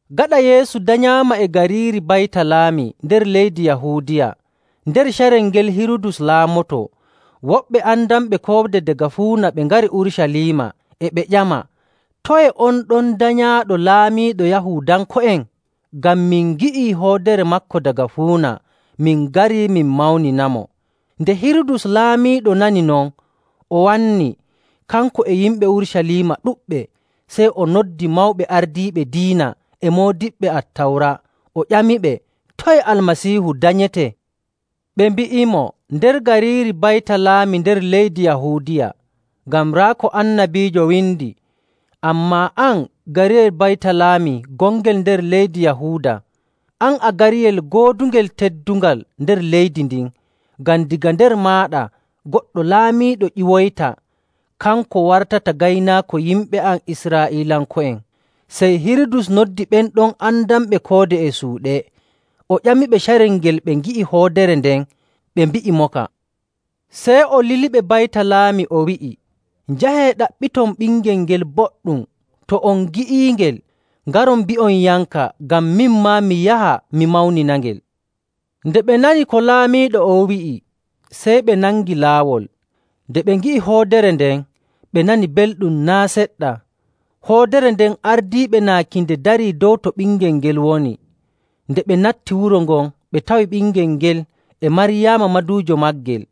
Gaɗa Yeesu danyaama e gariiri Baytalaami nder leydi Yahuudiya, nder carel ngel Hirudus laamoto, woɓɓe andanɓe koode daga fuuna ɓe ngari Urucaliima, e ɓe ƴama, “Toye on ɗon danyaaɗo laamiiɗo Yahuudanko'en? Ngam min ngi'i hoodere maako daga fuuna, min ngarii min mawninamo.” Nde Hirudus laamiiɗo nani non, o wanni, kanko e yimɓe Urucaliima ɗuɗɓe. Sey o noddi mawɓe ardiiɓe diina e moodiɓɓe Attawra, o ƴamiɓe, “Toye Almasiihu danyetee?” Ɓe mbi'imo, “Nder gariiri Baytalaami nder leydi Yahuudiya. Ngam raa ko annabiijo windi, ‘Ammaa, an, gariyel Baytalaami gongel nder leydi Yahuuda, an a gariyel goodungel teddungal nder leydi ndin, ngam daga nder maaɗa goɗɗo laamiiɗo ƴiwoyta, kanko wartata gaynaako yimɓe am Israa'iilanko'en.’”. Sey Hirudus noddi ɓen ɗon andanɓe koode e suuɗe, o ƴamiɓe carel ngel ɓe ngi'i hoodere nden, ɓe mbi'imoka. Sey o liliɓe Baytalaami, o wi'i, “Njahee ɗaɓɓiton ɓingel ngel boɗɗum. To on ngi'iingel, ngaron mbi'onyamka, ngam min maa mi yaha mi mawninangel.” Nde ɓe nani ko laamiiɗo on wi'i, sey ɓe nangi laawol. Nde ɓe ngi'i hoodere nden, ɓe nani belɗum naa' seɗɗa. Hoodere nden ardiiɓe naaki nde dari dow to ɓingel ngel woni. Nde ɓe natti wuro ngon, ɓe tawi ɓingel ngel e Maryaama maduujo maagel.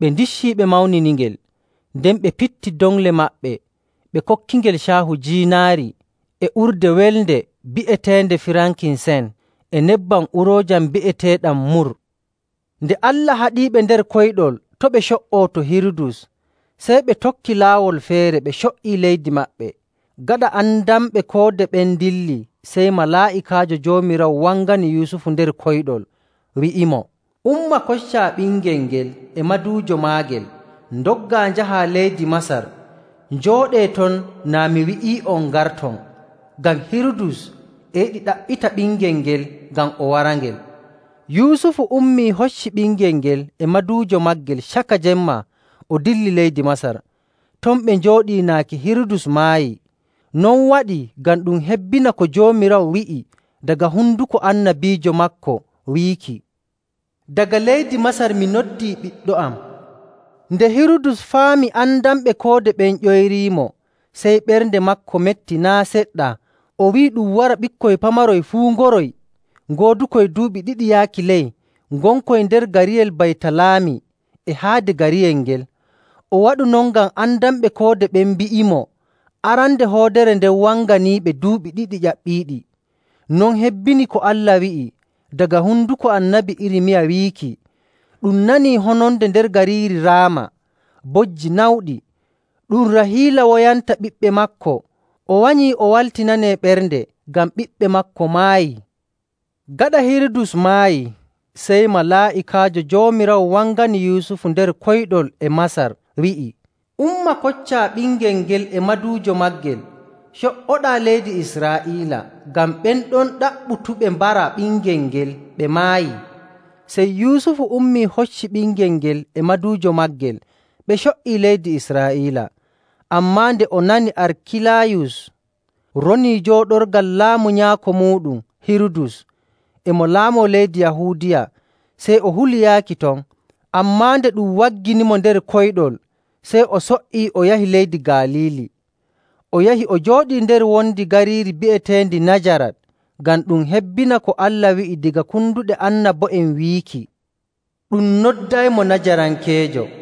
Ɓe ndicci ɓe mawniningel, nden ɓe pitti doŋle maɓɓe ɓe kokkingel caahu jiinaari, e urde welnde bi'eteende firankisen, e nebbam uroojam bi'eteeɗam mur. Nde Allah haɗiiɓe nder koyɗol to' ɓe co''oo to Hirudus, sey ɓe tokki laawol feere ɓe co''i leydi maɓɓe. Gaɗa andanɓe koode ɓen ndilli, sey malaa'ikaajo Joomiraawo wangani Yusufu nder koyɗol, wi'imo, “Umma koccaa ɓingel ngel e maduujo maagel ndoggaa njahaa leydi Masar. Njooɗee ton naa mi wi'ii'on ngarton, ngam Hirudus e yiɗi ɗaɓɓita ɓingel ngel ngam o warangel.” Yusufu ummii hocci ɓingel ngel e maduujo maagel caka jemma, o dilli leydi Masar. Ton ɓe njooɗi naaki Hirudus maayi. Non waɗii ngam ɗum hebbina ko Joomiraawo wi'i daga honduko annabiijo maako wiiki, “Daga leydi Masar mi noddi Ɓiɗɗo am.”. Nde Hirudus faami andanɓe koode ɓen ƴoyriimo, sey ɓernde maako metti naa' seɗɗa. O wi'i ɗum wara ɓikkoy pamaroy fuu ngoroy ngoodukoy duuɓi ɗiɗi yaaki ley ngonkoy nder gariyel Baytalaami e haade gariyel ngel. O waɗu non ngam andanɓe koode ɓen mbi'imo arande hoodere nden wanganiiɓe duuɓi ɗiɗi ƴaɓɓiiɗi. Non hebbini ko Allah wi'i daga honduko Annabi Irmiya wiiki, “Ɗum nani hononde nder gariiri Raama, bojji nawɗi. Ɗum Rahiila woyanta ɓiɓɓe maako, o wanyi o waltinanee ɓernde, ngam ɓiɓɓe maako maayi.”. Gaɗa Hirudus maayi, sey malaa'ikaajo Joomiraawo wangani Yusufu nder koyɗol e Masar, wi'i, “Umma koccaa ɓingel ngel e maduujo maagel co''oɗaa leydi Israa'iila, ngam ɓen ɗon ɗaɓɓutuɓe mbara ɓingel ngel ɓe maayi.” Sey Yusufu ummii, hocci ɓingel ngel e maduujo maagel, ɓe co''ii leydi Israa'iila. Ammaa nde o nani Arkilayus ronii jooɗorgal laamu nyaako muuɗum Hirudus e mo laamo leydi Yahuudiya, sey o huli yaaki ton. Ammaa nde ɗum wagginimo nder koyɗol, sey o so''i o yahi leydi Galiili. O yahi o jooɗii nder wondi gariiri bi'eteendi Najarat, ngam ɗum hebbina ko Allah wi'i daga konduɗe annabo'en wiiki, “Ɗum noddaymo Najarankeejo.”.